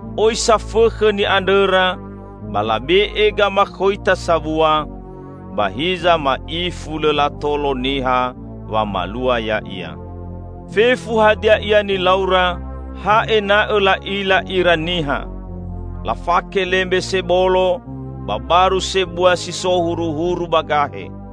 Oi safõkhõ ni'andrõra ba labe'e gamakhoita sabua, ba hiza ma'ifu lõ latolo niha wamalua ya'ia. Fefu hadia ia nilaura, ha ena'õ la'ila ira niha. Lafake lembe sebolo, ba baru sebua si so huruhuru ba gahe!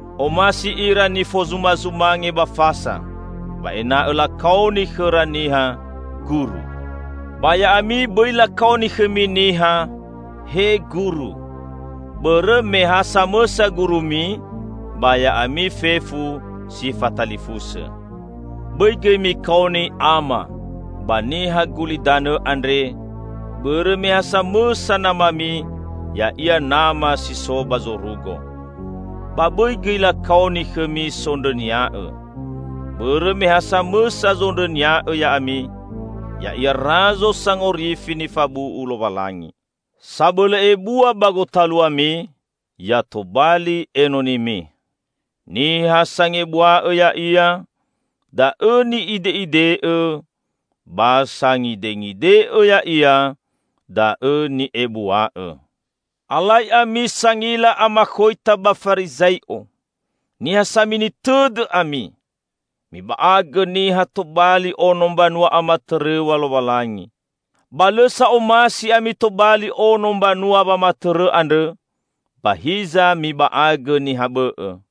Omasi ira nifozumazumange ba fasa. Ba ena'õ lakaoni khõra niha, 'Guru'. Ba ya'ami, bõi lakaoni khõmi niha, 'He Guru', bõrõ me ha samõsa Gurumi ba ya'ami fefu si fatalifusõ. Bõi gõi mikaoni 'Ama,' ba niha gulidanõ andre, bõrõ me ha samõsa namami, ya'ia Nama si so ba zorugo. Ba bõi gõi lakaoni khõmi 'Sondrõnia'õ', bõrõ me ha samõsa zondrõnia'õ ya'ami, ya'ia Razo Sangorifi nifabu'u Lowalangi. Sabõlõ ebua ba gotaluami, ya tobali enonimi. Niha sangebua'õ ya'ia, da'õ ni'ide'ide'õ, ba sangidengide'õ ya'ia da'õ ni'ebua'õ." "Alai ami Sangila Amakhoita ba Farizai'o! Niha samini tõdõ ami! Miba'agõ niha tobali ono mbanua amatõrõw̃a Lowalangi. Ba lõ sa omasi ami tobali ono mbanua wamatõrõ andrõ, ba hiza miba'agõ niha bõ'õ.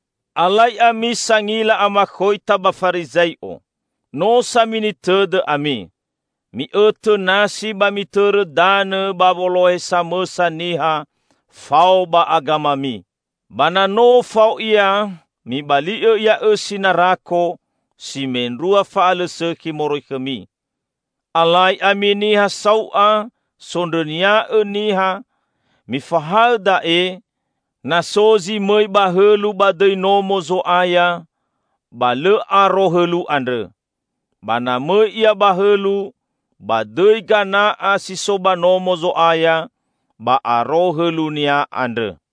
Alai ami Sangila Amakhoita ba Farizai'o! No samini tõdõ ami! Mi'õtõ nasi ba mitõrõ danõ ba wolohe samõsa niha fao ba agamami. Ba na no fao ia, mibali'õ ia õsi narako, si mendrua fa'alõsõkhi moroi khõmi! Alai ami niha sau'a sondrõnia'õ niha! Mifahaõ da'e, 'Na so zi mõi ba hõlu ba dõi Nomo Zo'aya, ba lõ aro hõlu andrõ; ba na mõi ia ba hõlu ba dõi gana'a si so ba Nomo Zo'aya, ba aro hõlunia andrõ.'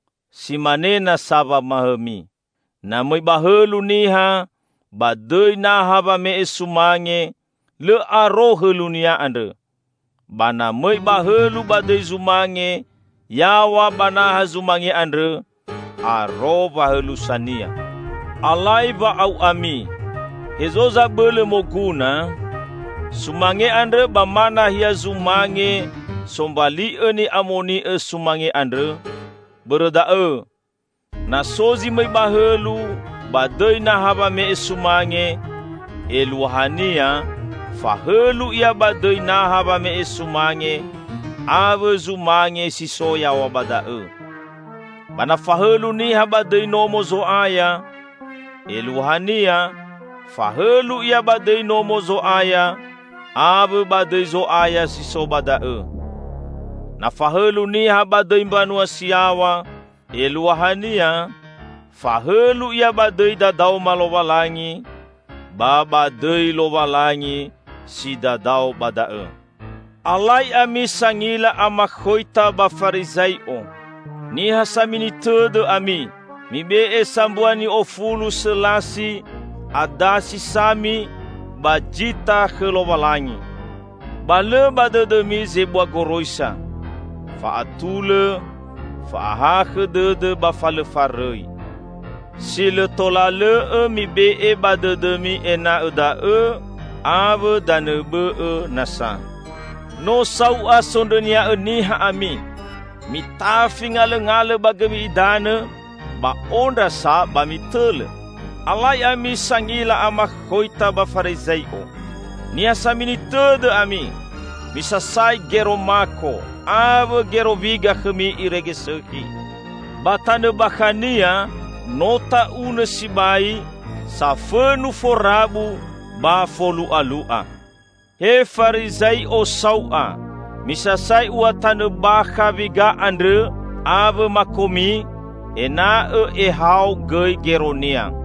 Si mane nasa wamahaõmi, 'Na mõi ba hõlu niha ba dõi naha wame'e sumange, lõ aro hõlunia andrõ; ba na mõi ba hõlu ba dõi zumange yaw̃a ba naha zumange andrõ, aro wahõlusania.' Alai wa'au'ami! Hezo zabõlõ moguna? Sumange andrõ ba ma nahia zumange sombali'õ ni'amoni'õ zumange andrõ? Bõrõ da'õ, na so zi mõi ba hõlu ba dõi naha wame'e sumange, eluahania fahõlu ia ba dõi naha wame'e sumange awõ zumange si so yaw̃a ba da'õ. Ba na fahõlu niha ba dõi Nomo Zo'aya, eluahania, fahõlu ia ba dõi Nomo Zo'aya awõ ba dõi Zo'aya si so ba da'õ. Na fahõlu niha ba dõi mbanua si yaw̃a, eluahania fahõlu ia ba dõi dadaoma Lowalangi, ba ba dõi Lowalangi si dadao ba da'õ. Alai ami Sangila Amakhoita ba Farizai'o! Niha samini tõdõ ami! Mibe'e sambua ni'ofulu selasi, adasi sami ba jita khõ Lowalangi. Ba lõ ba dõdõmi zebua goroisa: Fa'atulõ, fa'ahakhõ dõdõ ba fa lõ farõi. Si lõ tola lõ'õ mibe'e ba dõdõmi ena'õ da'õ awõ danõ bõ'õ nasa. No sau'a sondrõnia'õ niha ami! Mitafi ngalõngalõ ba gõmi idanõ, ba ondra sa ba mitõlõ! Alai ami, Sangila Amakhoita ba Farizai'o! Niha samini tõdõ ami! Misasai gero mako awõ gero wiga khõmi irege sõkhi, ba tanõ bakhania no ta'unõ sibai, safõnu forabu ba folu'alu'a. He Farizai'o sau'a! Misasai ua tanõ bakha wiga andrõ awõ makomi, ena'õ ehao gõi geronia!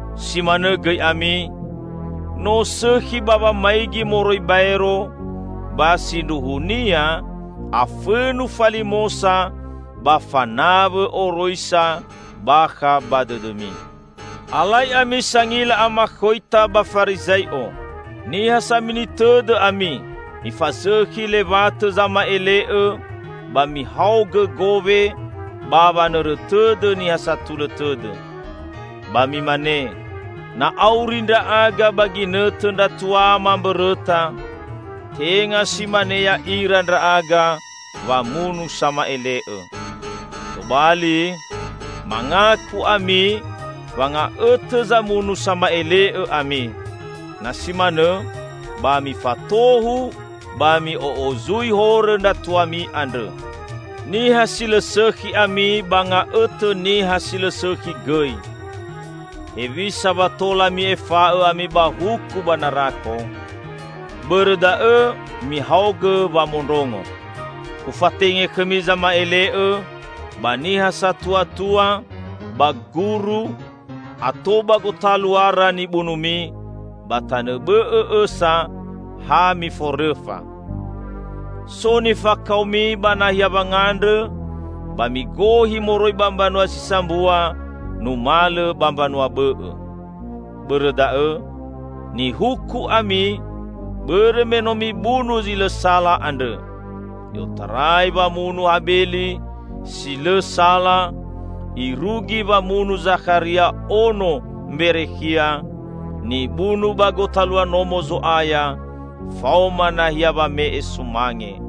Si manõ gõi ami, no sõkhi ba wamaigi moroi baero, ba sindruhunia afõnu falimosa ba fanawõ oroisa bakha ba dõdõmi." "Alai ami Sangila Amakhoita ba Farizai'o! Niha samini tõdõ ami! Mifazõkhi lewatõ zama'ele'õ ba mihaogõ gowe ba wanõrõ tõdõ niha satulõ tõdõ. Ba mimane, 'Na auri ndra'aga ba ginõtõ ndra tuama mbõrõta, tenga si mane ya'ira ndra'aga wamunu sama'ele'õ.' Tobali, mangaku ami wa nga'õtõ zamunu sama'ele'õ ami! Na si manõ ba mifatohu ba mi'o'ozui horõ ndra tuami andrõ! Niha si lõ sõkhi ami ba nga'õtõ niha si lõsõkhi gõi! Hewisa wa tola mi'efa'õ ami ba huku ba narako? Bõrõ da'õ, mihaogõ wamondrongo: Ufatenge khõmi zama'ele'õ, ba niha satuatua, ba guru; ato ba gotaluara nibunumi, ba tanõ bõ'õ õsa ha miforõfa. So nifakaomi ba nahia wangandrõ, ba migohi moroi ba mbanua si sambua numalõ ba mbanua bõ'õ. Bõrõ da'õ, nihuku ami bõrõ me no mibunu zi lõ sala andrõ -- i'otarai wamunu Habeli si lõ sala, irugi wamunu Zakharia ono Mberekhia, nibunu ba gotalua Nomo Zo'aya faoma nahia wame'e sumange.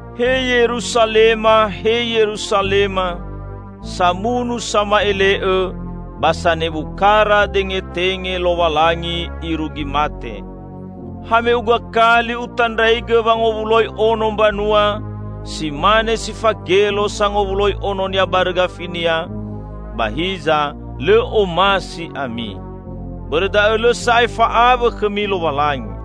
"He Yeruzalema, he Yeruzalema! Samunu sama'ele'õ, ba sanebu kara dengetenge Lowalangi irugi mate! Hame'uga kali Utandraigõ wangowuloi ono mbanua, si mane si fagelo sangowuloi ononia barõ gafinia, ba hiza lõ omasi ami! Bõrõ da'õ' lõ sa'ae fa'awõ khõmi Lowalangi.